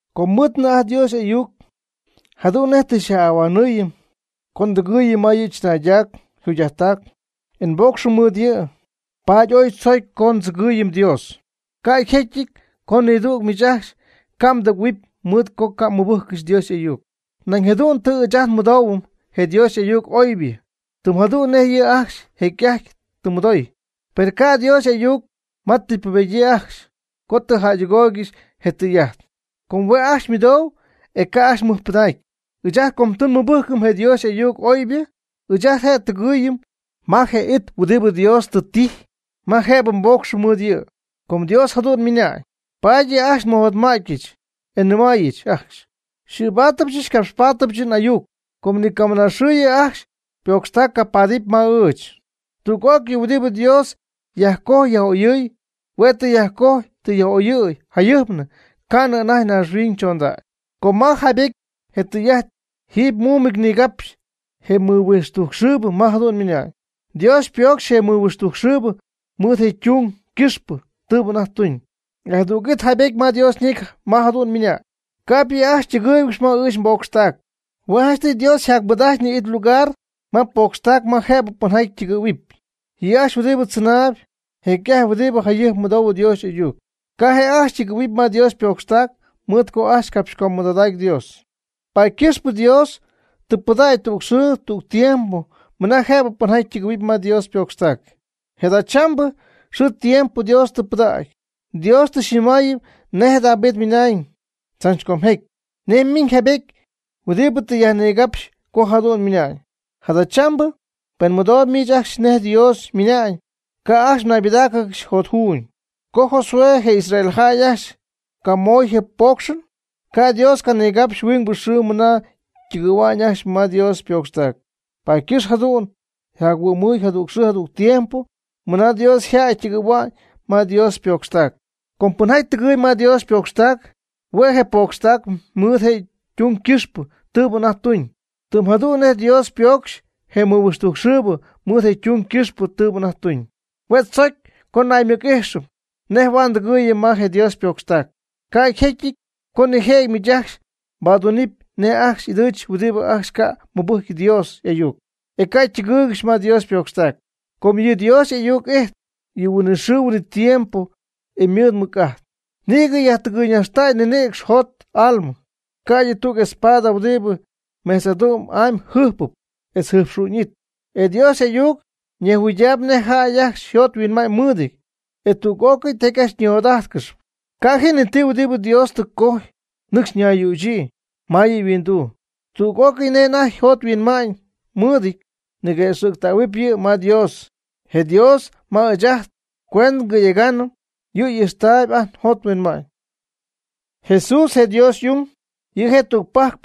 Com nmɨɨdnɨ ajt Dios y'ayuc, jadu'n nej tɨ xyaj'ahuanɨɨyɨm co ndɨgɨɨyɨm ma yɨ' chɨnaydac yjugy'ajttac, e nboocxɨm mɨɨd yɨ'. Paady ooy tzocy co ndzɨgɨɨyɨm Dios. Ca' jecyɨty co nidüg miich ajcxy ca' mdɨgɨ̈huɨpy mɨɨd co ca' mmɨbɨjccɨxy Dios y'ayuc. Nañ jadu'n tɨ ɨɨch ajt nmɨdoohuɨm je Dios y'ayuc oybɨ, tɨm jadu'n nej yɨ' ajcxy jecy'ajty tɨ mɨdooy. Per ca' Dios y'ayuc ma tɨ ypubedyii ajcxy co tɨ jamɨdoogɨxy je tɨy'ajt. Com hue' ajcxy ymɨdou, e ca' ajcxy mɨjpɨdacy. Ɨɨch ajt com tɨ nmɨbɨjcɨm je Dios y'ayuc oybɨ, ɨɨch ajt je' tɨgɨ́ɨyɨmɨp ma je it huɨdibɨ Dios tɨ tijy ma jëbɨ nboocxɨm mɨɨd yɨ'. Com Dios jadu'n ymɨnañ: Paady yɨ' ajcxy nmɨjotma'tyɨch, e nnɨmäyɨch ajcxy, n'ɨɨbaadyɨch ngapxpaadyɨch n'ayuc, co ni camɨna xɨɨ yɨ' ajcxy ypocxtac capaadɨpy ma ɨɨch. Tüg'ócɨy huɨdibɨ Dios yajcojy yaj'oyɨɨy, hue' tɨ yajcojy tɨ yaj'oyɨɨy jayɨjpnɨ ca'nɨ anajty naaxhuiñybɨ chondacy. Com ma yjaybetyɨty je tɨy'ajt jiiby muumɨty nigapxy je mɨhuixtujcxɨɨbɨ ma jadu'n ymɨna'ñ: Dios ypoocxy je mɨhuixtujcxɨɨbɨ mɨɨd je' ytung ycɨxpɨ tɨɨbɨ anajty tuñ. E jadüg it yjaybetyɨty ma Dios ñecy ma jadu'n ymɨnañ: Ca'p yɨ' ajcxy ytɨgɨ́ɨygɨxɨpy ma ɨɨch nbocxtac. Hue' janchtɨy Dios yjacmɨɨd'ajtyñɨ it lugar ma ypocxtac ma jëbɨ pɨnjaty ytɨgɨ̈huɨp. Yɨ' ajcxy huɨdibɨ tzɨnay jecy'ajty huɨdibɨ jayɨjp mɨdou Dios y'ayuc, ca' je' ajcxy ytɨgɨɨy ma Dios ypocxtac, mɨɨd co ajcxy capxycömɨdoodacy Dios. Paady ycɨxpɨ Dios tɨ pɨdägy tüg xɨɨ tüg tiempo mɨna jëbɨ pɨnjaty tɨgɨ̈huɨpy ma yɨ' ypocxtac. Je' jadachambɨ xɨɨ tiempo Dios tɨ pɨdägy. Dios tɨ xyñɨmaayɨm nej David ymɨnañ tzach com jecy, nej miiñ jaybety huɨdibɨ tɨ yajnigapxy co jadu'n ymɨna'ñ: Jadachambɨ pen mɨdooyb miich ajcxy nej Dios ymɨna'ñ, ca' ajcxy mnaybɨdáacɨgɨxy jotjuuñ. Co Josué je Israel jäy ajcxy camoy je poocxɨn, ca' Dios canigapxy huingbɨ xɨɨ mɨna ytɨgɨ̈hua'ñ ajcxy ma Dios ypocxtac. Paady ycɨxp, jadu'n yjac-huɨ'myñɨ jadüg xɨɨ tiempo mɨna Dios yjäy ytɨgɨ̈hua'ñ ma Dios ypocxtac. Com pɨnjaty tɨgɨɨyb ma Dios ypocxtac hue' je' ypocxy mɨɨd je' ytung ycɨxpɨ tɨɨbɨ anajty tuñ, tɨm jadu'n nej Dios ypoocxy je mɨhuixtujcxɨɨbɨ mɨɨd je' ytung ycɨxpɨ tɨɨbɨ anajty tuñ. Hue' tzocy co naymɨc'ijxɨm nej huaad ndɨgɨɨyɨm ma je Dios ypocxtac, ca' yjecyɨty co nijëjɨty miich ajcxy mbaduunɨpy nej ajcxy y'ɨdɨɨch huɨdibɨ ajcxy ca' mɨbɨjcy Dios y'ayuc, e ca' mdɨgɨɨygɨxɨpy ma Dios ypocxtac. Com yɨ Dios y'ayuc ijtp yɨ' huinɨxɨɨ huinɨtiempo, e ymɨɨd mɨc'ajt. Nïgɨ yajtɨgɨyñajxtäy ninïcx, jot almɨ, ca'ydɨ tüg espada huɨdibɨ mejtz'adu'm'amy jɨjpɨp etz yjɨjpxu'ñɨty. E Dios y'ayuc nejhuɨydaayb nej jäy ajcxy yjot yhuinma'ñ mɨɨdɨty, e tüg'ócɨy tijaty ajcxy ñijot'ajtcɨxyp. Ca' ji ni ti huɨdibɨ Dios tɨ yajcojy nɨcxy ñayyüchyii ma yɨ' yhuinduu. Tüg'ócɨy nej ajt njot nhuinma'ñ nmɨɨdɨty ñiguëxɨ̈ctähuɨp yɨ' ma Dios, je Dios ma ɨɨch ajt nguendɨ ngɨ̈yegaanɨm, yɨ' ijxtaayb ajt njot nhuinma'ñ. Jesús, je Dios y'ung, yɨ' je' tügpajc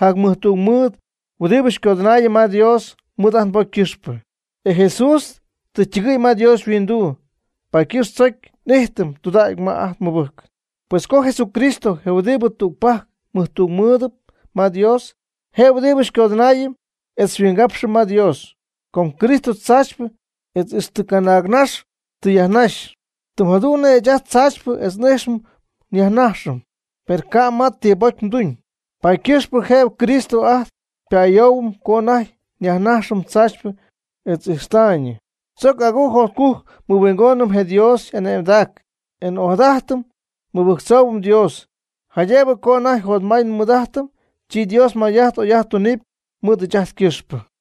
jacmɨjtungmɨɨd huɨdibɨ xycodɨnaayɨm ma Dios mɨɨd ajt nbocy ycɨxpɨ. E Jesús tɨ ytɨgɨ̈y ma Dios yhuinduu, paady ycɨxp tzoc ijtɨm tudägy ma ajt nmɨbɨjcɨn. Pues com Jesucristo, je huɨdibɨ tügpajc mɨjtungmɨɨdɨp ma Dios, je huɨdibɨ xycodɨnaayɨm etz xyhuingapxɨm ma Dios, com Cristo tzaachypɨ etz ijxta'nɨ canaagnax tɨ yajnaxy, tɨm jadu'n nej ɨɨch ajt tzaachypɨ etz ijxta'nɨ nyajnajxɨm, per je' ca' ma ti bocy tuuñ. Paady ycɨxpɨ jëbɨ Cristo ajt xypa'ayoohuɨm co ajt nyajnajxɨm tzaachypɨ etz ijxta'nɨ. Tzoc agujc jotcujc nmɨhuingoonɨm je Dios y'ane'mdac e n'ojadajtɨm nmɨbɨjctzoohuɨm Dios, jaydëbɨ co anajty jotmay nmɨɨd'ajtɨm, chi Dios may'ajt oy'ajt tunɨpy mɨɨd ɨɨch ajt ycɨxpɨ.